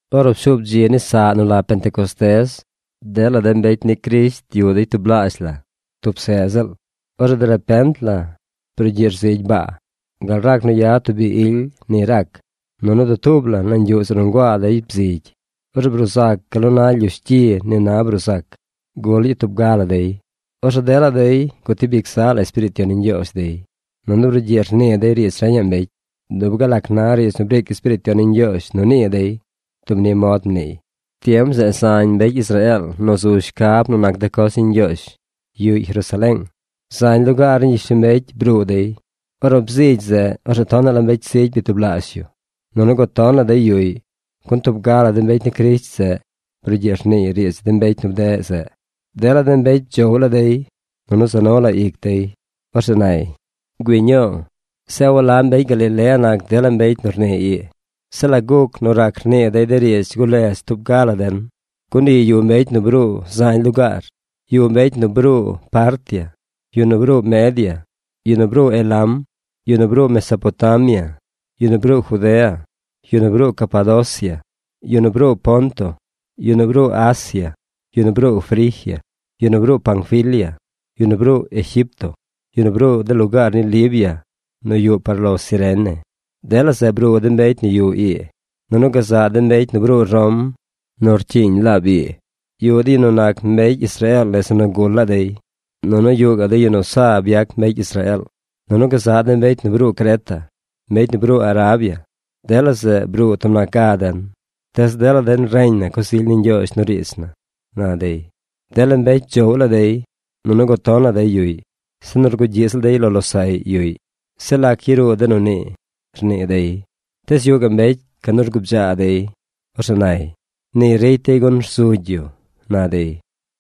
Ornu pshuub dzi ni saꞌ nu la Pentecostés, dela de mbecy ni Crisht yuꞌ dey tublaazh la tub seꞌ ziꞌl. Orzeꞌ derepent la brugyiꞌ rzigy baa. Gal rac nu yad tub bi ily ni rac. Nunu dutuub la nañ yuꞌ zeꞌ nu nguaa dey bzigy. Orzeꞌ bruu zac gal nu na lyush gyi na bruu zac. Gul ñii tub ga la dey. Orzeꞌ dela dey gutib ic zaꞌ la Espiriit Yon ni Ñgyoozh dey, nunu brugyiꞌ rnii dey riidz reñaꞌ mbecy. Dub gal lac na riidz nu briic Espiriit Yon ni Ñgyoozh nu nii dey dub ni mod mniiy. Tiem zeꞌ zañ mbecy Israeel nu zu shcab nu nac de coz ni Ñgyoozh yuꞌy Jerusaleeng. Zañ lugaar ni gyishlombecy bruu dey. Ornu bzigy zeꞌ, orzeꞌ tonaꞌ la mbecy zigy byatublaazh yu. Nunu guton la dey yuꞌy, gun tub ga la de mbecy ni Crisht zeꞌ brugyiꞌ rniiy riidz de mbecy nu bdeꞌ zeꞌ. Dela mbecy bdzoꞌw laa dey, nunu za nu la ic dey. Orzeꞌ nay: ―¡Güii ñuu! Zeꞌ ¿a walab mbecy Galilea nac dela mbecy nu rnii ii? Zeꞌ ¿lac guc nu rac rnii dey de riidz guledz tub ga la den? Gun ii yuꞌ mbecy nu bruu zañ lugaar. Yuꞌ mbecy nu bruu Partia, yu nu bruu Media, yu nu bruu Elam, yu nu bruu Mesopotamia, yu nu bruu Judea, yu nu bruu Capadocia, yu nu bruu Ponto, yu nu bruu Asia, yu nu bruu Frigia, yu nu bruu Panfilia, yu nu bruu Egipto, yu nu bruu de lugaar ni Libia nu yuꞌ par lo Cirene. Dela zeꞌ bruu de mbecy nu yuꞌ ii. Nunu gazaꞌ de mbecy nu bruu Rom nu rcyiiñ laab ii. Yuꞌ de yu nu nac mbecy Israeel nese nu gul laa dey, nunu yuꞌ gaꞌ de yu nu byac mbecy Israeel. Nunu gazaꞌ mbecy nu bruu Creta, mbecy nu bruu Arabia. ¡Dela zeꞌ bruu tub nac ga den, tees dela den reñ na coz ily ni Ñgyoozh nu riidz na! ―na dey. Dela mbecy bdzoꞌw laa dey, nunu guton la dey yuꞌy. Se nu rgugyiꞌ ziꞌl dey lo losaꞌy yuꞌy: ―Zeꞌ ¿lac yaruu de nu nii? ―rnii dey. Tees yuꞌ gaꞌ mbecy canu rgubdzaa dey. Orzeꞌ nay: ―¡Ni ricy dey gun rzugy yu! ―na dey.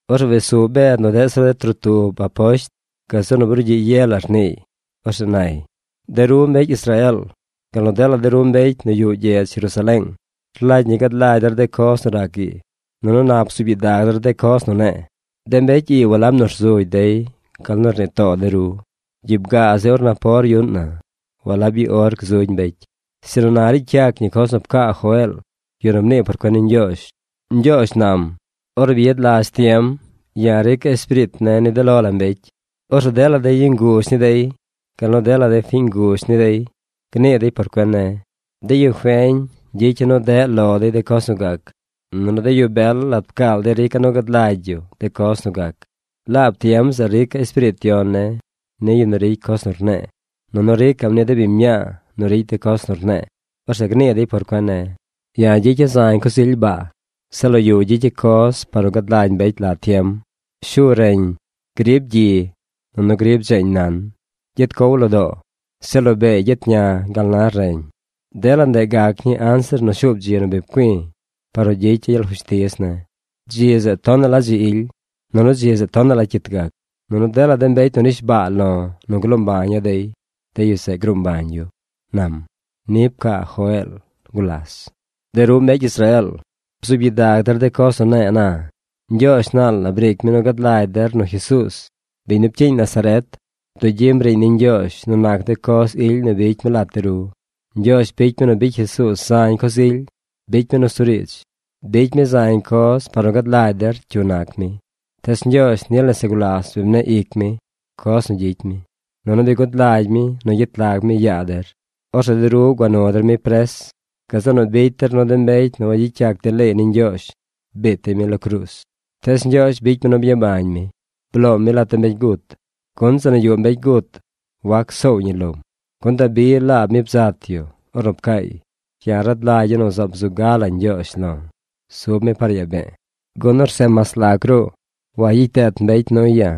Orzeꞌ wes su Bed nu deꞌ zir de trotub aposht gazeꞌ nu brugyiꞌ ye la rniiy. Orzeꞌ nay: ―De ru mbecy Israeel, gal nu dela de ru mbecy nu yuꞌ gyedz Jerusaleeng, rlagy ñi gad lagy der de coz nu rac ii, nunu nap bzuub gyidag der de coz nu ne̱e̱. De mbecy ii walab nu rzugy dey gal nu rnii too de ru. Gyiib gaa zi or napor yuꞌn na. Walab i or gzugy mbecy. Sinu na ricy yac ñi coz nu pcaa Joeel, yu nu mnii por cuen ni Ñgyoozh. Ñgyoozh nam: Ornu bi yad lazh tiem, ya̱ rica̱ Espiriit ne̱ ni de lo la mbecy. Orzeꞌ dela de yu nguzh ni dey, gal nu dela de fiñ nguzh ni dey, gnii dey por cuen ne̱. De yu feñ gyicya̱ nu deꞌ lo dey de coz nu gac. Nunu de yu bel lat pcaal dey rica̱ nu gad lagy yu de coz nu gac. Laab tiem zeꞌ rica̱ Espiriit Yon ne̱ ni yu nu ricy coz nu rne̱e̱, nunu rica̱ꞌm ni de biñ mñaa nu ricy de coz nu rne̱e̱. Orzeꞌ gnii dey por cuen ne̱. Ya̱ gyicya̱ zañ coz ily baa. Zeꞌ lo yu gyicya̱ coz par nu gad lagy mbecy la tiem. Shu reñ; grib gyi; nunu grib dzeeñ nan. Gyet cow lo doo. Zeꞌ lo beey gyet ña gal na reñ. Dela ndeꞌ gac ñii anzir nu shuub dzi nu bi pcui̱ par nu gyicy ya̱ gyel fushtiz ne̱. Dzi zeꞌ tonaꞌ la dzi ily. Nunu dzi zeꞌ tonaꞌ la cyit gac. Nunu dela mbecy nu nish baa lo̱ nu gloo mbaña̱ dey, de yu zeꞌ gruu mbañ yu, nam. Ni pcaa Joeel gulas. ’De ru mbecy Israeel, bzuub gyidag der de coz nu ne̱e̱ na. Ñgyoozh naal la briic mi nu gad lagy der nu Jesuuz, biñ nu pcyiiñ Nazaret, bduꞌ gyim riiñ ni Ñgyoozh nu nac de coz ily nu bicy mi lat de ru. Ñgyoozh bicy mi nu bicy Jesuuz zañ coz ily. Bicy mi nusuriidz. Bicy mi zañ coz par nu gad lagy der cyu nac mi. Tees Ñgyoozh nil nese gulas bi mne̱ꞌ ic mi, coz nu gyicy mi. Nunu bi gud lagy mi nu gyet lag mi yaa der. Orzeꞌ de ru gua nu der mi pres. Gazeꞌ nu bicy der nu de mbecy nu wagyicy yac de leey ni Ñgyoozh biit dey mi lo cruuz. Tees Ñgyoozh bicy mi nu byabañ mi. Bloom mi lat de mbecy gut, gun zeꞌ nu yuꞌ mbecy gut wac soow ñi lom. Gun Dabi laab mi bzat yu ornu pcaay: Ya̱ rad lagya̱ nu zaab zu gala Ñgyoozh lo̱. Zub mi par yaa be̱e̱, gun orzeꞌ mas lac ruꞌ wagyicy deet mbecy nuy ya̱.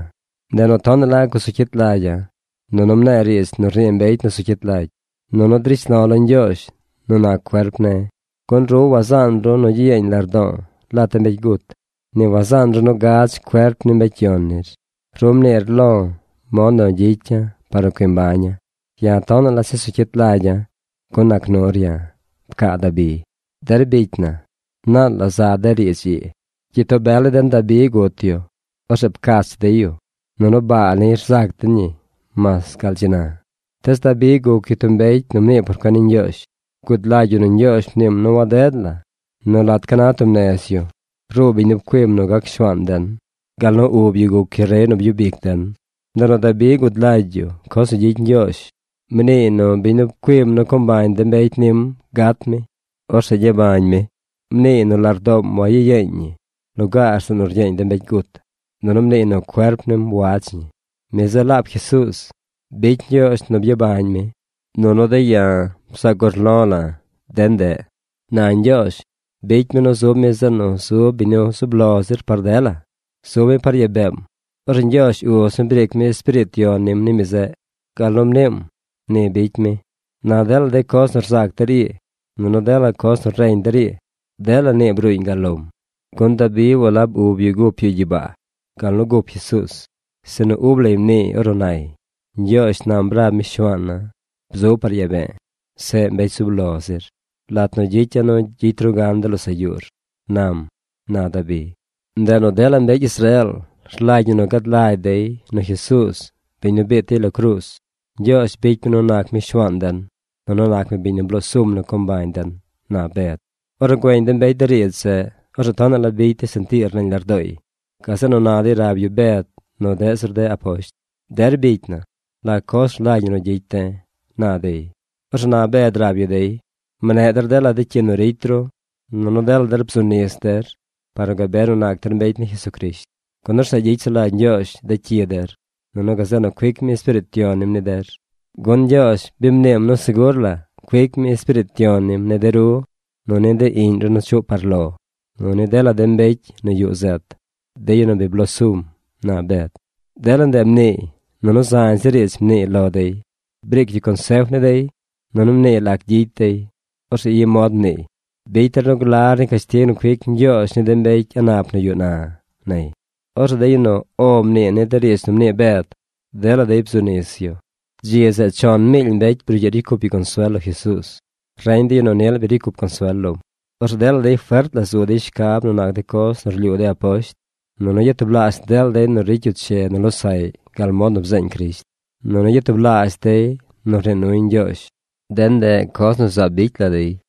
Ndeꞌ nu tonaꞌ la gusu cyit lagya̱, nunu mne̱e̱ riidz nu rnii mbecy nu zu cyit lagy. Nunu drish lo̱ lo Ñgyoozh nu nac cuerp ne̱. Gun ru wazaan ru nu gyiyeeñ lardo̱o̱ lat de mbecy gut. Ni wazaan ru nu gadz cuerp ni mbecy yon nir. Ru mniir lo̱ mod nu gyicya̱ par nu cui mbaña̱. Ya̱ tonaꞌ la chesu cyit lagya̱, gun nac nur ya̱, pcaa Dabi. ’Der bicy na, naal la za de riidz ii. Gyitoo bel ni den Dabi gut yu. Orzeꞌ pcach dey yu. Nunu baa niy rzac den ñi mas gal dzi na. Tees Dabi guc yu tub mbecy nu mnii por cuen ni Ñgyoozh. Gud lagy yu nu Ñgyoozh mniim nu waded la nu lat ca na tub nez yu, ruu biñ nu pcuim nu gac Shuaan den gal nu ub yu guc yu rey nu byub ic den. Ndeꞌ nu Dabi gud lagy yu coz nu gyicy Ñgyoozh. Mniiy nu biñ nu pcuim nu co mbañ de mbecy nim gat mi. Orzeꞌ gyabañ mi. Mniiy nu lardoom wayiyeeñ ñi lugaar zeꞌ nu ryeeñ de mbecy gut, nunu mniiy nu cuerp nim wadz ñi. Mi zeꞌ laab Jesuuz. Bicy Ñgyoozh nu byabañ mi, nunu de̱ ya̱ bzaac urlo̱ la̱ de ndeꞌ. Na Ñgyoozh bicy mi nu zub mi zeꞌ nu zub biñ zub lo zir par dela. Zub mi par yaa beem. Orzeꞌ Ñgyoozh Uz mi briic mi Espiriit Yon nim ni mi zeꞌ. Gal nu mniim, ni bicy mi. Na dela coz nu rzac der ii, nunu dela coz nu reñ der ii, dela nii bruuñ gal lom. Gun Dabi walab ub yu gup yu gyibaa gal nu gup Jesuuz. Sinu ub lay mniiy ornu nay: Ñgyoozh nam rab mi Shuaan na: Bzub par yaa be̱e̱, seꞌ mbecy zub lo zir, Lat nu gyicya̱ nu gyicy ru gan de losaꞌ yuur, nam, na Dabi. ’Ndeꞌ nu dela mbecy Israeel rlagy ñi nu gad lagy dey nu Jesuuz, biñ nu biit dey lo cruuz, Ñgyoozh bicy mi nu nac mi Shuaan den, nunu nac mi biñ nu bloo sum nu co mbañ den ―na Bed. Ornu güeñ de mbecy de riidz zeꞌ, orzeꞌ tonaꞌ la bicy dey sentiir nañ lardooy. Gazeꞌ nu na dey rab yu Bed nu deꞌ zir de aposht: ―Der bicy na, ¿la coz rlagy ñi nu gyicy de̱? ―na dey. Orzeꞌ na Bed rab yu dey: ―Mne̱ꞌ der dela de cyi nu ricy ru, nunu dela der bzu nis der par nu gabe nu nac der mbecy ni Jesucrisht, gun orzeꞌ gyicy sulagy Ñgyoozh de cyi der, nunu gazeꞌ nu cuic mi Espiriit Yon nim ni der. Gun Ñgyoozh bi mniim nu segur la cuic mi Espiriit Yon nim ni de ru nu ni de iꞌñ ru nu chuꞌ par lo, nu ni dela de mbecy nu yuꞌ zet, de yu nu bi blosum ―na Bed. Dela ndeꞌ mniiy, nunu zañ zir riidz mniiy lo dey. Briic yu consef ni dey. Nunu mniiy lac gyicy dey. Orzeꞌ i mod mniiy: ―Bicy der nu glar ni cashtig nu cuic Ñgyoozh ni de mbecy a̱ꞌ nap nu yuꞌ na ―nay. Orzeꞌ de yu nu “O” mnii ni de riidz nu mnii Bed, dela dey bzu nis yu. Dzi zeꞌ chon miily mbecy brugyiꞌ ricy cup yu consuel lo Jesuuz, reñ de yu nu nil bi ricy cup consuel lom. Orzeꞌ dela dey fert la zu dey shcab nu nac de coz nu rlyuu de aposht. Nunu yatublaazh dela dey nu ro nuy losaꞌy riidz. Nunu yatublaazh dela dey ricy yu che nu losaꞌy gal mod nu bzeeñ Crisht. Nunu yatublaazh dey nii nuy Ñgyoozh. De ndeꞌ coz nu zaab bicy la dey.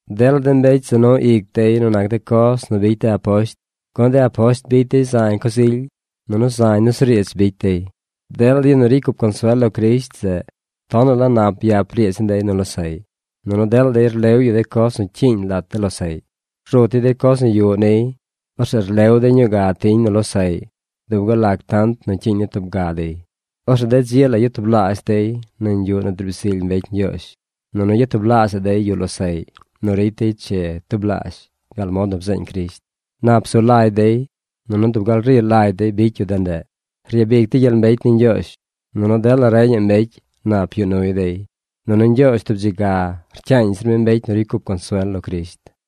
Dela de mbecy za nu ic dey nu nac de coz nu bicy de aposht, gun de aposht bicy dey zañ coz ily. Nunu zañ nusuriidz bicy dey. Dela de yu nu ricy cup consuel lo Crisht zeꞌ tonaꞌ la nap byap riidz ni dey nu losaꞌy. Nunu dela dey rlew yu de coz nu cyiiñ lat de losaꞌy. Rut dey de coz nu yuꞌ niy. Orzeꞌ rlew dey ñuu ga tiñ nu losaꞌy dub gal lac tant nu cyiiñ ni tub ga dey. Orzeꞌ de dzi la yatublaazh dey nañ yuꞌ nu driib zily mbecy Ñgyoozh, nunu yatublaazhaꞌ dey yuꞌ losaꞌy nu ricy dey che tublaazh gal mod nu bzeeñ Crisht. Nap zu lagy dey. Nunu dub gal ri lagy dey bicy yu de ndeꞌ. Ryabic dey gyel mbecy ni Ñgyoozh. Nunu dela reñaꞌ mbecy, nap yuꞌ nuy dey. Nunu Ñgyoozh tub dzi ga rcyaañ zir mi mbecy nu ricy cup consuel lo Crisht.